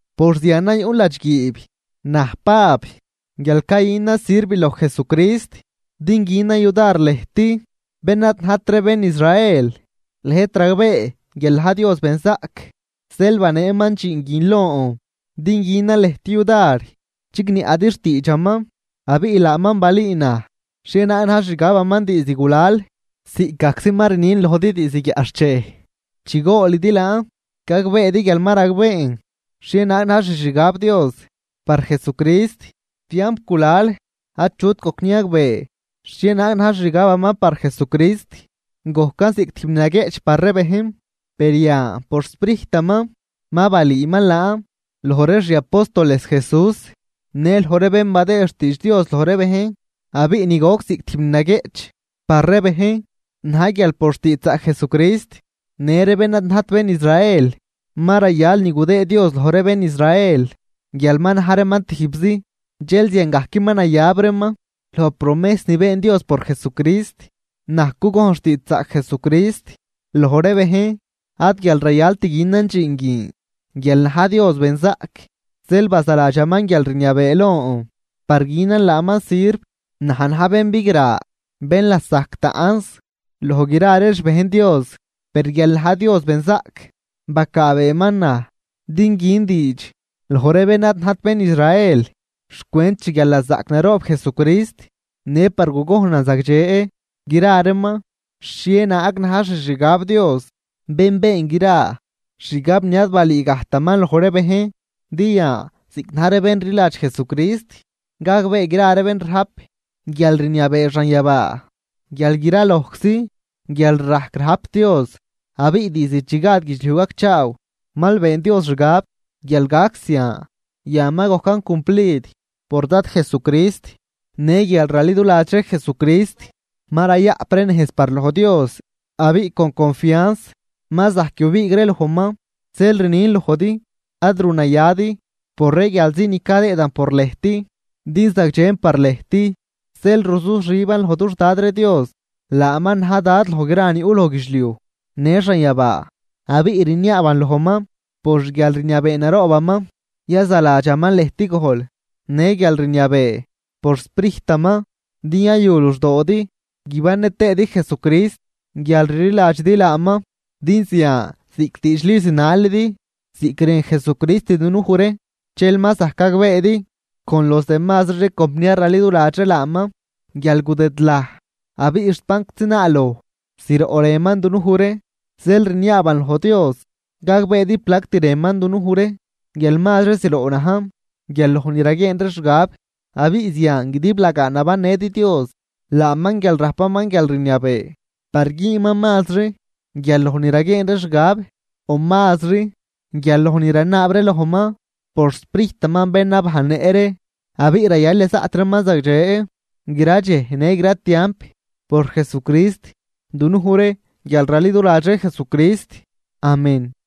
Por zianan yuꞌn ladxguiib, naj Pab guial cayünan sirv loj Jesucrist din günan yudar lëjt bén ad najt ree bén Israel. Lëjt ragbee guial na̱j Dios benzaꞌc zeel baneeman dxiin guin lon din günan lëjt yudar chigniaꞌdi xtiidxaman. Abiꞌ laaman balüü naj xhienaag na̱j xixgabaman diizd gulal, ziꞌcgajczi ma rnin lojdi diizd guiaꞌxchej. Chi goolidi laan, gagbeedi guial ma ragbeen xhienaag na̱j xixgab Dios par Jesucrist. Tiamp gulal achut gojc niagbee xhienaag na̱j xixgabaman par Jesucrist, gojcan ziꞌc tijb ni naguieꞌch par ree bejn. Per yan por xSprijtaman ma balüüman laan loj ree xi apóstoles Jesús në loj ree bén badëë xtiidx Dios loj ree bejn. Abiꞌ ni goc ziꞌc tijb ni naguieꞌch par ree bejn na̱j guial por xtiidxzaꞌc Jesucrist, në ree bén ad najt bén Israel ma rayal ni gudëë Dios loj ree bén Israel guial ma na̱j reeman tijbzi, dxel ziangajc ma nayab reeman loj promejs ni been Dios por Jesucrist. Naj cugojn xtiidxzaꞌc Jesucrist loj ree bejn, ad guial rayalt günan dxiin guin. Guial na̱j Dios benzaꞌc, zeel bazaladxaman guialrniabee lon par günan laaman sirv. Naj na̱j bén bigra bén lasajc taꞌnz loj gra ree xbejn Dios, per guial na̱j Dios benzaꞌc, bacaabeeman naj din gün diidx loj ree bén ad najt bén Israel xcwent xguialnazaꞌc naroob Jesucrist, në par gugojnan zagdxe gra reeman xhienaag na̱j xixgab Dios bén been gra, xgab ni ad balüü gajtaman loj ree bejn. Din yan ziꞌc na̱j ree bén rliladx Jesucrist, gagbee gra ree bén rajp guialrniabee xanyabaa guial gra lojczi guialrajc rajp Dios. Abiꞌ diizd chi gad guidxliuj gacchaaw mal been Dios xgab guial gac zian. Yan ma gojcan cumplid por Dad Jesucrist. Në guial raliduladx ree Jesucrist ma rayaꞌp ree nejz par loj Dios, abiꞌ con confians ma zajc yubiig ree lojman. Zeel rnin lojdi ad runayadi por ree guialzi ni cadëëdan por lëjt, din zagdxen par lëjt. Zeel ruzuxiban loj dux Dad ree Dios; laaman na̱j Dad loj gra ni yuꞌ loj guidxliuj në xanyabaa. Abiꞌ rniaaban lojman por xguialrniabee naroobaman yazaladxaman lëjt gojl në guialrniabee por xSprijtaman din yayu luxdoodi, guibannë tëëdi Jesucrist guial rliladxidi laaman. Din zian ziꞌc diidxli zinalidi ziꞌc rën Jesucrist dunuj ree, dxel ma zajc gagbeedi con los demazri ree compniar raliduladx ree laaman guial gudëdlaj abiꞌ xt banczi naaloj zroꞌ rënman dunuj ree. Zeel rniaaban loj Dios gagbeedi plact rënman dunuj ree, guial mazri zroꞌ najn guial loj ni raguieen ree xgab, abiꞌ zian guidiblagaa guibannëdi Dios. Laaman, guial rajpaman guialrniabee par güünman mazri guial loj ni raguieen ree xgab o mazri guial loj ni ranaab ree lojman por xSprijtaman bén nabajnnëꞌ ree, abiꞌ rayal yazaꞌt reeman zagdxe gra dxej në gra tiamp por Jesucrist, dunuj ree guial raliduladx ree Jesucrist. Amén.